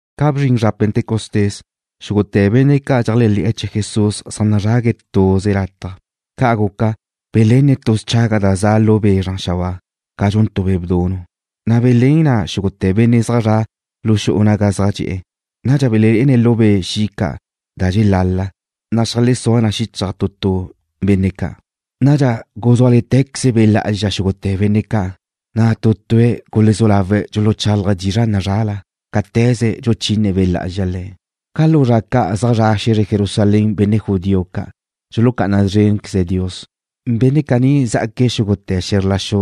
Ca bzrin zra Pentecostés, xúgute̱ benne' ca' dxeléajle̱'e̱ chee̱ Jesús zaj nazrague̱' tuze lataj. Ca' guca, belenne̱' tu schaga da za' lu be' zran xabáa, ca dxun tu be' bdunu', na' belén na xúgute̱ benne' zaj zre̱'e̱ lu xu'u naga zaj dxe'e̱. Nadxa belelé'ene̱' lu be' xi' ca', da dxelala, na' xeajlezúa na xíchaj tu tu benne' ca'. Nadxa guzúale̱tequeze Be' Lá'azxa xúgute̱ benne' ca', na' tu tue̱' gulezú lawe̱' dxuluchálaje̱' dizra' nazrala cáte̱ze dxuchine Be' Lá'azxa le̱'. Ca lu zra ca' zaj zra' xe̱zre Jerusalén benne' judío ca' dxulucá'ana szrénqueze̱' Dios. Benne' caní zá'aque̱' xúgute̱ xe̱zr la xu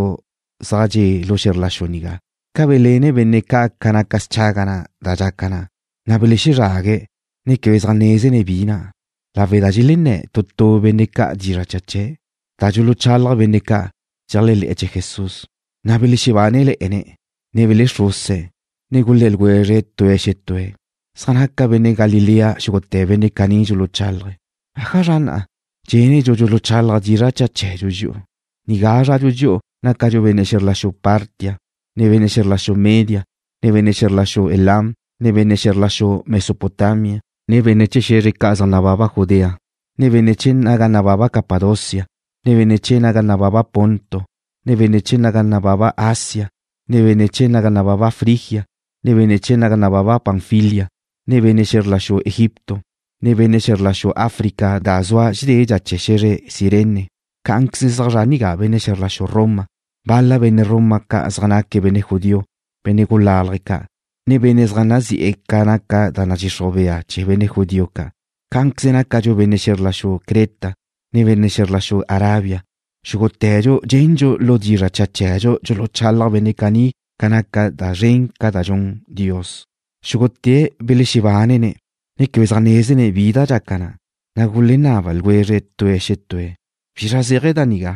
zaj dxe' lu xe̱zr la xu nigá. Ca belenne̱' bénneache ca naca schaga na' da dxaca na, na' belexezrague̱', ne quebe zaj nézene̱' bi na', lawe' da dxelén tu tu benne' ca' dizra' cha chee̱' da dxuluchalaj benne' ca' dxeléajle̱'e̱ chee̱ Jesús. Na' belexebánele̱'e̱ne̱', ne belexruse̱', ne gulé̱ ljwezre̱' tue̱' xetúe̱': ―Zaj naca benne' Galilea xúgute̱ benne' caní dxuluchálaje̱'. ¿Ájazra na' dxendxu dxuluchálaje̱' dizra' cha chee̱dxu dxi'u? Zradxu dxi'u nigá, nácadxu benne' xe̱zr la xu Partia, ne benne' xe̱zr la xu Media, ne benne' xe̱zr la xu Elam, ne benne' xe̱zr la xu Mesopotamia, ne benne' chee̱ xe̱zre ca' zaj nababa Judea, ne benne' chee̱ naga nababa Capadocia, ne benne' chee̱ naga nababa Ponto, ne benne' chee̱ naga nababa Asia, ne benne' chee̱ naga nababa Frigia, ne benne' chee̱ naga nababa Panfilia, ne benne' xe̱zr la xu Egipto, ne benne' chee̱ xe̱zr la xu Africa da zua dédedxa chee̱ xe̱zre Cirene. Cá'anqueze zaj zra' benne' xe̱zr la xu Roma nigá. Bal-la benne' Roma ca' zaj naque̱' benne' judío, benne' gulálaje̱' ca', ne benne' zaj nazi'e̱ ca naca da nadxixruj bea chee̱ benne' judío ca'. Cá'anqueze nácadxu benne' xe̱zr la xu Creta, ne benne' xe̱zr la xu Arabia. Xúgute̱dxu dxendxu lu dizra' cha chee̱dxu dxuluchalaj benne' caní ca naca da zren ca' da dxun Dios. Xúgute̱' belexebánene̱', ne quebe zaj nézene̱' bi da dxaca na', na' gulenaba ljwezre̱' tue̱' xetúe̱': ―¿Bizra zéaje̱ da nigá?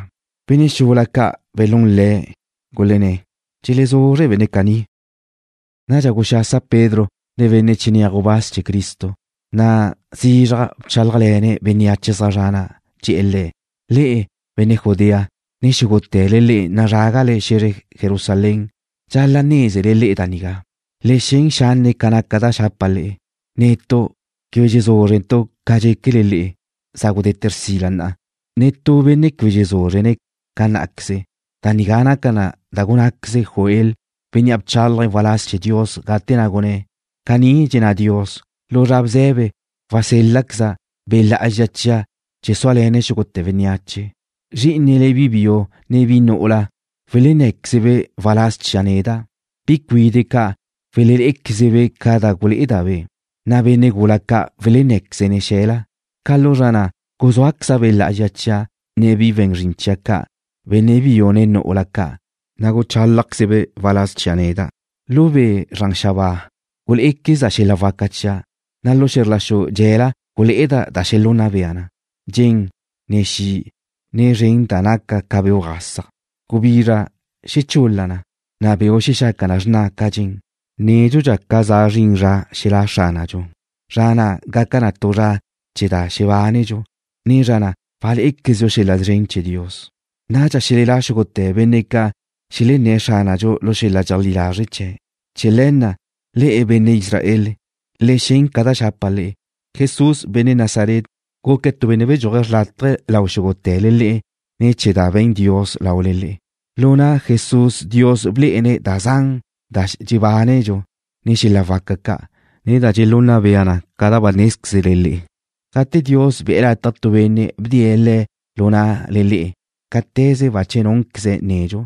Benne' xula ca' belún le̱', gulenné̱': ―Dxelezuzre benne' caní. Nadxa guxasa Pedro nen benne' chinéaj gubáz chee̱ Cristo, na' zizraj bchálajle̱ne̱' bénneache zaj zra' na'. Dxe̱'e̱ le̱': ―Le'e, benne' Judea, ne xúgute̱le le'e nazrágale xe̱zre Jerusalén. Dxal-la' nézele le'e da nigá. Le xen xanne' ca naca da xapa' le'e. Netu' quebe dxezúzrentu' ca dxéquele le'e. Za gudete̱ xrsila na'a. Netú benne' quebe dxezúzrene̱' ca ná'queze. Da nigá naca da gunnáqueze Joel, bénnea' bchálaje̱' waláz chee̱ Dios gate na' gunné̱': Caní dxenná Dios: “Lu zra bze̱be wasél-laqueza' Be' Lá'azxa chia' chee̱ súale̱ne̱' xúgute̱ bénneache. Zrí'inele bi biu ne bi nu'ula welenné̱quezebe' waláz chia' neda'. Bi cuide' ca' welelé'equezebe' ca da gulé'eda'-be'. Na' benne' gula ca' welennéquezene̱' xe̱la. Ca lu zra na' guzuáqueza' Be' Lá'azxa chia' nen bi we̱n zrin chia' ca', benne' biu ne nu'ula ca', na' guchálajquezebe' waláz chia' neda'. Lu be' zran xabáa gulé'equezda' xel-la' waca chia', na' lu xe̱zr la xu dxe'ela gulé'eda' da xelunna bea na, dxen, ne xi', ne zren da naca ca beuj gasaj.” Gubizra xechul-la na, na' beu' xexaca na xrna ca dxen nedxu ca za zrin zra xelá' Xránadxu. Zra na' gaca na tu zra chee̱ da xebánedxu ne zra na' walé'equezdxu xel-la' szren chee̱ Dios. Nadxa xelelá xúgute̱ benne' ca' xelenné̱' Xránadxu lu xel-la' dxeleajlí lazre' chee̱'. ’Chee̱ le̱ na', le'e, benne' Israel, le xen ca da xapa' le'e. Jesús, benne' Nazaret, guque̱' tu benne' bedxúaje̱' xrlátaje lau xúgute̱le le'e ne̱ chee̱ da be̱n Dios laule le'e. Lu na' Jesús Dios blé'ene̱' da zan da dxebánedxu, ne xel-la' waca ca', ne da dxelunna bea na ca ba nézquezle le'e. Gate Dios be̱'e̱ lataj tu benne' bdee̱' Le̱' lu na'le le'e cáte̱ze bache núnqueze̱' nedxu,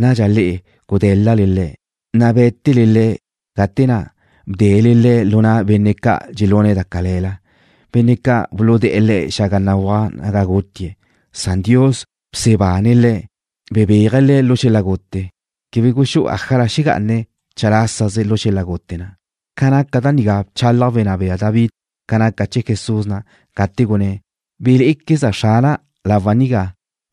nadxa le'e gudé̱l-lale Le̱', na' bé̱tele Le̱' gate na' bdele Le̱' lu na' benne' ca' dxelune̱' da cale̱la, benne' ca' buludé̱'e̱ Le̱' xaga béguaj naga gutie̱'. Nadxa Dios bsebane̱' Le̱', bebéaje̱' Le̱' lu xel-la' gute. Quebe guxú'u ájala xegá'ane̱' chalásaze lu xel-la' gute na'. Ca naca da nigá bchalaj wenná bea David ca naca chee̱ Jesús na', gate gunné̱': Belé'equezda' Xrana' lawa' nigá.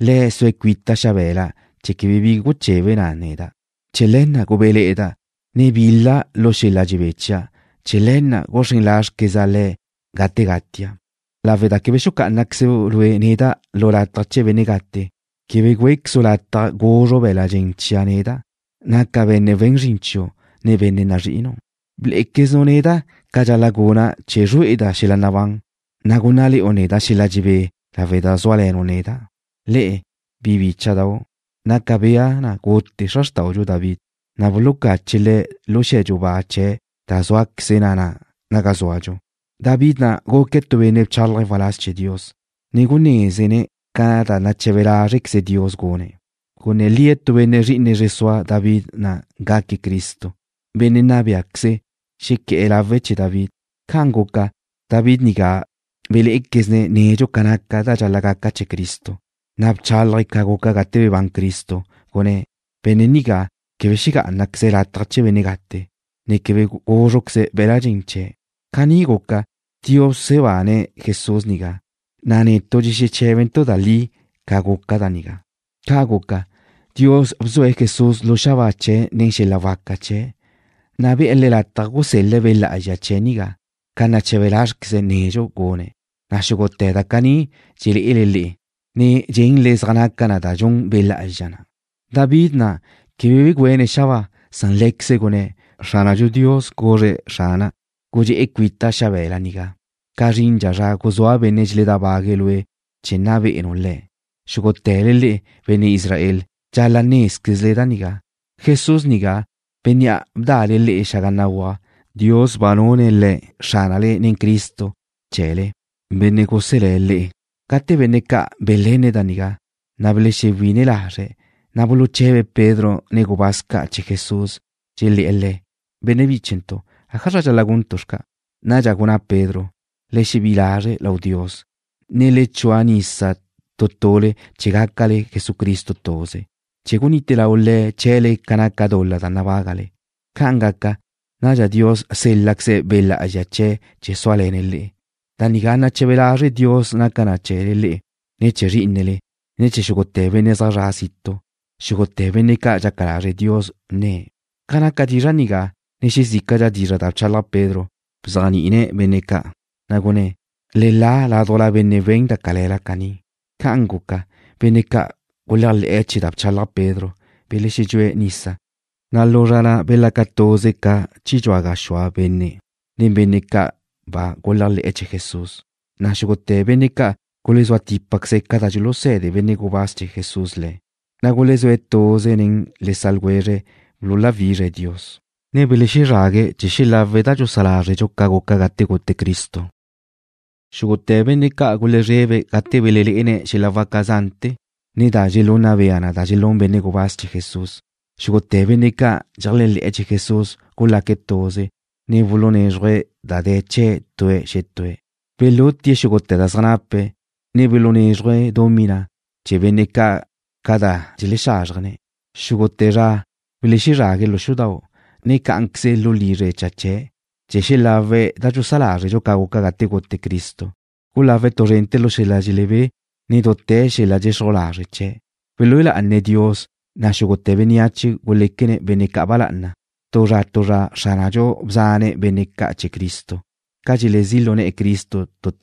Le̱' zue̱' cuita' xabe̱la, chee̱ quebe bi guchebe na neda'. Chee̱ le̱ na' gubéle̱'e̱da', ne bil-la' lu xel-la' dxebé chia'. Chee̱ le̱ na' guxrén lázrequeza' Le̱' gate gatia', lawe' da quebe xucá'anaquezu' neda' lu lataj chee̱ benne' gate. Quebe güéquezu' lataj guzru be̱l-la' dxen chia' neda', naca' benne' we̱n zrin chiu', ne benne' nazrí'inu'. Blé'equezenu' neda' ca dxal-la' guna' chee̱ zrué'eda' xel-la' nabán, na' gúnnale̱'u neda' xel-la' dxebé lawe' da zúale̱nu' neda'. ’Le'e, bi bícha'dau'. Naca bea na gute xra xrtáudxu David, na' bulucache̱' le̱' lu xe̱dxu ba chee̱' da zúaqueze na na'a nagá zúadxu. David na' guque̱' tu benne' bchálaje̱' waláz chee̱ Dios, ne gunézene̱' ca da nache̱be lázrequeze Dios gune̱'. Gunné̱ lie̱' tu benne' zri'ine zre sua David na' gaque̱' Cristo, Bénnea' nna béaqueze̱', xequé̱'e̱ lawe̱' chee̱ David. Ca' guca, David nigá belé'equezne̱' nedxu ca naca da dxal-la' gaca chee̱ Cristo, na' bchálaje̱' ca guca gate bebán Cristo, gunné̱': “Benne' nigá quebe xegá'anaqueze̱' lataj chee̱ benne' gate, ne quebe gúzruqueze be̱l-la' dxen chee̱'.” Caní guca, Dios bsebane̱' Jesús nigá, na' netu' dxexeché̱bentu' da li ca guca da nigá. Ca' guca, Dios bzue̱' Jesús lu xabáa chee̱' nen xel-la' waca chee̱', na' be̱'e̱ Le̱' lataj gusel-le̱' Be' Lá'azxa chee̱' nigá ca nache̱be lázrequeze̱' nedxu gune̱', na' xúgute̱ da caní dxelé'ele le'e, ne dxenle zaj naca na da dxun Be' Lá'azxa na'. David na' quebe begüéne̱' xabáa, san lé̱queze̱' gune̱': Xránadxu Dios guzre̱' Xrana': “Gudxe'e cuita' xabe̱la nigá ca zrindxa zra guzúa' benne' dxedábague̱' lue' chee̱ nna be'enu le̱'.” ’Xúgute̱le le'e, benne' Israel, dxal-la' nézquezle da nigá: Jesús nigá, bénnea' bda'le le'e xaga béguaj, Dios ba nune̱' Le̱' Xránale ne Cristo chee̱le, Benne' guselé̱' le'e. Gate benne' ca' belenne̱' da nigá, na' belexewí'ine lazre̱', na' buluche̱be̱' Pedro, ne benne' gubáz ca' chee̱ Jesús, dxelé̱'e̱ le̱': ―Benne' bíchentu', ¿ájazra dxal-la' guntu' xca'? Nadxa gunná Pedro: ―Le xebí'i lazre' lau Dios, ne le chua nisa tu tule chee̱ gácale Jesucristo tuze, chee̱ gunite lau Le̱' chee̱le le'e ca naca dul-la da nabágale. Ca' gaca, nadxa Dios sél-laqueze̱' Be' Lá'azxa chee̱' chee̱ súale̱ne̱' le'e. Da nigá nache̱be lazre' Dios naca na chee̱le le'e, ne chee̱ zrí'inele, ne chee̱ xúgute̱ benne' zaj zre̱'e̱ zitu', xúgute̱ benne' ca' dxaca lazre' Dios nne̱'. Ca naca dizra' nigá, ne xezícaladxa dizra' da bchalaj Pedro, bzéajni'ine̱' benne' ca', na' gunné̱': ―Le la ládujla benne' we̱n da cale̱la caní. Ca'an guca, benne' ca' guléajle̱'e̱ chee̱ da bchalaj Pedro belexedxúe̱' nisa, na' lu zra na' belaca tuze ca chi dxua gaxúa benne' nen benne' ca' ba dxeléajle̱'e̱ chee̱ Jesús. Na' xúgute̱ benne' ca' gulezúa típaqueze̱' ca da dxuluse̱de benne' gubáz chee̱ Jesús le̱', na' gulezúe̱' tuze nen le sa' ljwezre̱' chee̱ bululáwizre̱' Dios, ne buluzrague̱' chee̱ xelawe̱' da dxusá lázredxu ca guca gate gute Cristo. Xúgute̱ benne' ca' gulezrebe̱' gate belelé'ene̱' xel-la' waca zante̱, ne da dxelunna bea na da dxelún benne' gubáz chee̱ Jesús. Xúgute̱ benne' ca' dxeléajle̱'e̱ chee̱ Jesús gulaque̱' tuze, ne bulunézruje̱' da de̱ chee̱' tue̱' xetúe̱'. Belutie̱' xúgute̱ da zaj nape̱', ne bulunézruje̱' dumí na' chee̱ benne' ca' ca da dxelexázrjene̱'. Xugu' zra belexezrague̱' lu xudau', ne cá'anqueze lu lizre cha chee̱', chee̱ xelawe̱' da dxusá lázredxu ca guca gate gute Cristo. Gulawe̱' tu zrente̱ lu xel-la' dxelebé, ne dute̱ xel-la' dxelexruj lazre' chee̱'. Belúe lá'ane̱' Dios, na' xúgute̱ bénneache guléquene̱' benne' ca' ba lá'ana. Tu zra tu zra Xránadxu bzane̱' benne' ca' chee̱ Cristo ca dxelezí' lu ne̱'e̱ tu tue̱' Cristo.